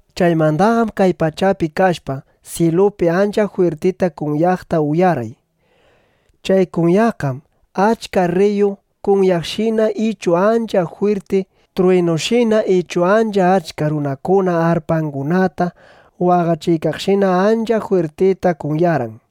Chaymandaqam kay pachapi kashpa, syilupi ancha jwirtita kunyaqta uyarqay. Chay kunyaqqam achka rriyu kunyaykaqshina ichu ancha jwirti truwinushina ichu ancha achka runakuna arpangunata waqachiykaqshina ancha jwirtita kunyarqan.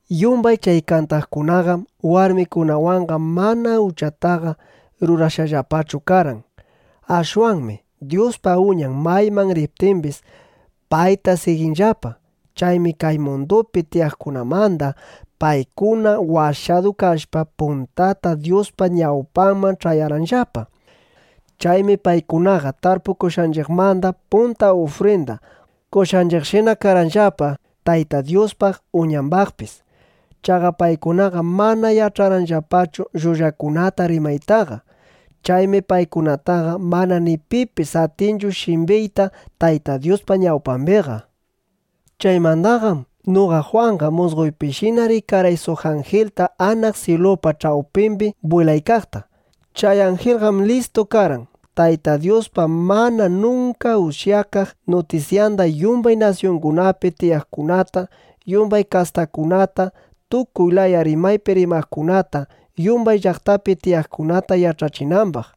Yumbay chay kantaqkunaqam warmikunawanqa mana uchataqa rurashqallapachu karqan. Ashwanmi Dyuspa Uñan mayman riptimbis, payta siginllapa. Chaymi kay mundupi tiyaqkunamanda paykuna washadu kashpa, puntata Dyuspa ñawpanman ch'ayarqanllapa. Chaymi paykunaqa tarpukushqanchiqmanda punta ufrinda qoshqanchiqshina karqanllapa Tayta Dyuspaq, Uñambaqpis. Chaqa paykunaqam mana yach'anllapachu llullakunata rimaytaqa. Chaymi paykunataqa mana ni pipis atinchu shimbiyta Tayta Dyuspa ñawpambiqa. Chaymandaqam noqa Jwanqa musqoypishina rikarqay suq anjilta anaq syilupa ch'awpimbi bwilaykaqta. Chay anjilqam listu karqan, Tayta Dyuspa mana nunka ushyakaq nutisyanda yumbay nasyungunapi tiyaqkunata, yumbay kastakunata, tukuy laya rimaypi rimaqkunata, yumbay llaqtapi tiyaqkunata yach'achinambaq.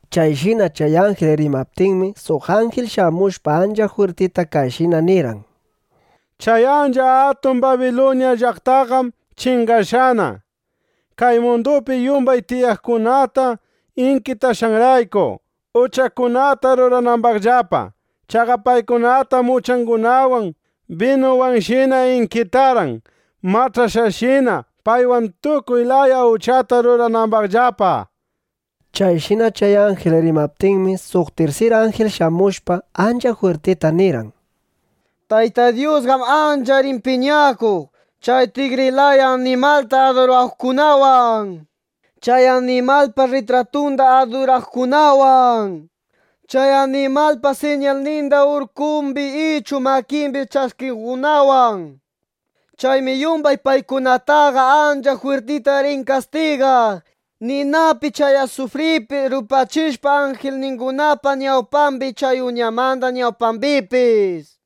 Chayshina chay anjil rimaptinmi, suq anjil shamushpa ancha jwirtita kayshina nirqan: —¡Chay ancha atun Babiluña llaqtaqam chingashqana, kay mundupi yumbay tiyaqkunata inkitashqanrayku, uchakunata ruranambaqllapa! Chaqa paykunatam uchangunawan binuwanshina inkitarqan, mach'ashqashina, paywan tukuy laya uchata ruranambaqllapa. Chayshina chay anjil rimaptinmi, suq tirsir anjil shamushpa, ancha jwirtita nirqan: —Tayta Dyusqam ancha rin piñakuq chay tigri laya animalta aduraqkunawan, chay animalpa rritratunda aduraqkunawan, chay animalpa siñalninda urkumbi ichu makimbi ch'askiqkunawan. Chaymi yumbay paykunataqa ancha jwirtita rin kastigaq ninapi chay asufripi rupachishpa anjilningunapa ñawpambi, chay Uñamba ñawpambipis.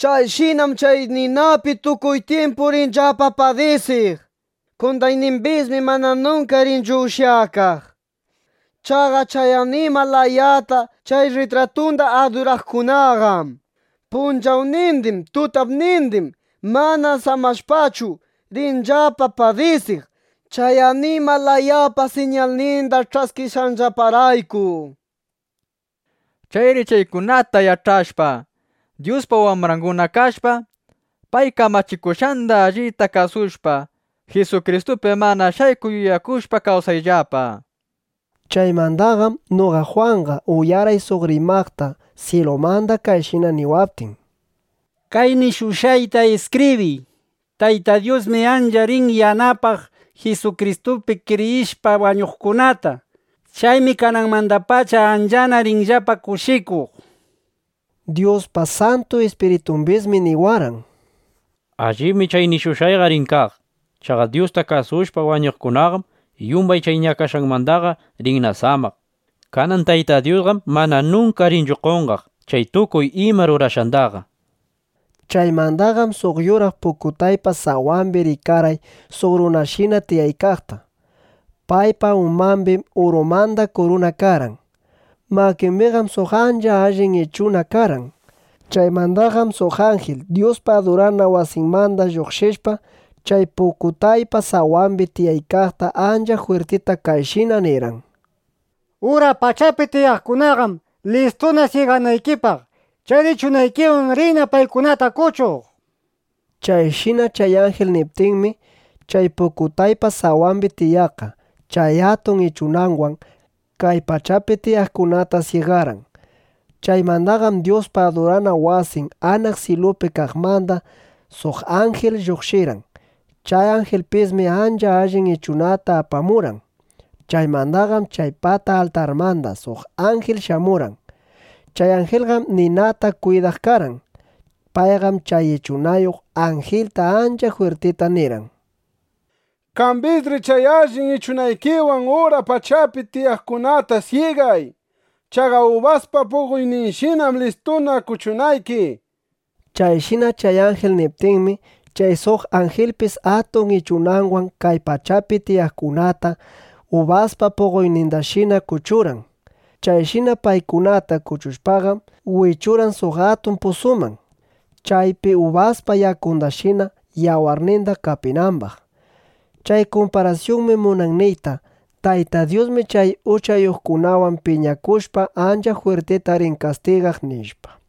Chayshinam chay ninapi tukuy tyimpu rinllapa padisiq. Qondaynimbismi mana nunka rinchu ushyakaq. Chaqa chay animal layata, chay rritratunda aduraqkunaqam punchawnindin, tutapnindin mana samashpachu, rinllapa padisiq, chay animal layapa siñalninda ch'askishqanllaparayku. Chayri chaykunata yach'ashpa, Dyuspa wambranguna kashpa, pay kamachikushqanda allita kasushpa, Jisukristupi mana shaykuq yuyakushpa, kawsayllapa, nishpa. Chaymandaqam noqa Jwanqa uyarqay suq rimaqta syilumanda kayshina niwaptin: —Kay nishushqaykunata iskibriy: “Tayta Dyusmi ancha rin yanapaq Jisukristupi kriyishpa wañuqkunata. Chaymi kananmandapacha anchana rinllapa kushikuq”, nishpa. Dyuspa Santu Ispiritumbismi niwarqan: —Allibmi chay nishushqanqa rin kaq. Chaqa Dyusta kasushpa wañuqkunaqam yumbay chay ñakashqanmandaqa rinna samaq. Kanan Tayta Dyusqam mana nunka rinchu qonqaq chay tukuy ima rurashqandaqa. Chaymandaqam suq yuraq pukutaypa sawambi rikarqay suq runashina tiyaykaqta. Paypa umambim urumanda kuruna karqan. Makimbiqam suq ancha allin ichuna karqan. Chaymandaqam suq anjil Dyuspa adurana wasinmanda lluqshishpa, chay pukutaypa sawambi tiyaykaqta ancha jwirtita kayshina nirqan: —Ura pachapi tiyaqkunaqam listuna syiganaykipaq. Chayri ichunaykiwan riyna paykunata kuchuq, nishpa. Chayshina chay anjil niptinmi, chay pukutaypa sawambi tiyaqqa chay atun ichunanwan kay pachapi tiyaqkunata syigarqan. Chaymandaqam Dyuspa adurana wasin anaq syilupi kaqmanda suq anjil lluqshirqan. Chay anjilpismi ancha allin ichunata apamurqan. Chaymandaqam chay pata altarmanda suq anjil shamurqan. Chay anjilqam ninata kwidaq karqan. Payqam chay ichunayuq anjilta ancha jwirtita nirqan: —Qambisri chay allin ichunaykiwan ura pachapi tiyaqkunata syigay. Chaqa ubaspa puqoyninshinam listuna kuchunayki. Chayshina chay anjil niptinmi, chay suq anjilpis atun ichunanwan kay pachapi tiyaqkunata ubaspa puqoynindashina kuchurqan. Chayshina paykunata kuchushpaqam, wichurqan suq atun pusuman, chaypi ubaspa yakundashina yawarninda qapinambaq. Chay kumparasyunmi munan niyta: Tayta Dyusmi chay uchayuqkunawan piñakushpa, ancha jwirtita rin kastigaq, nishpa.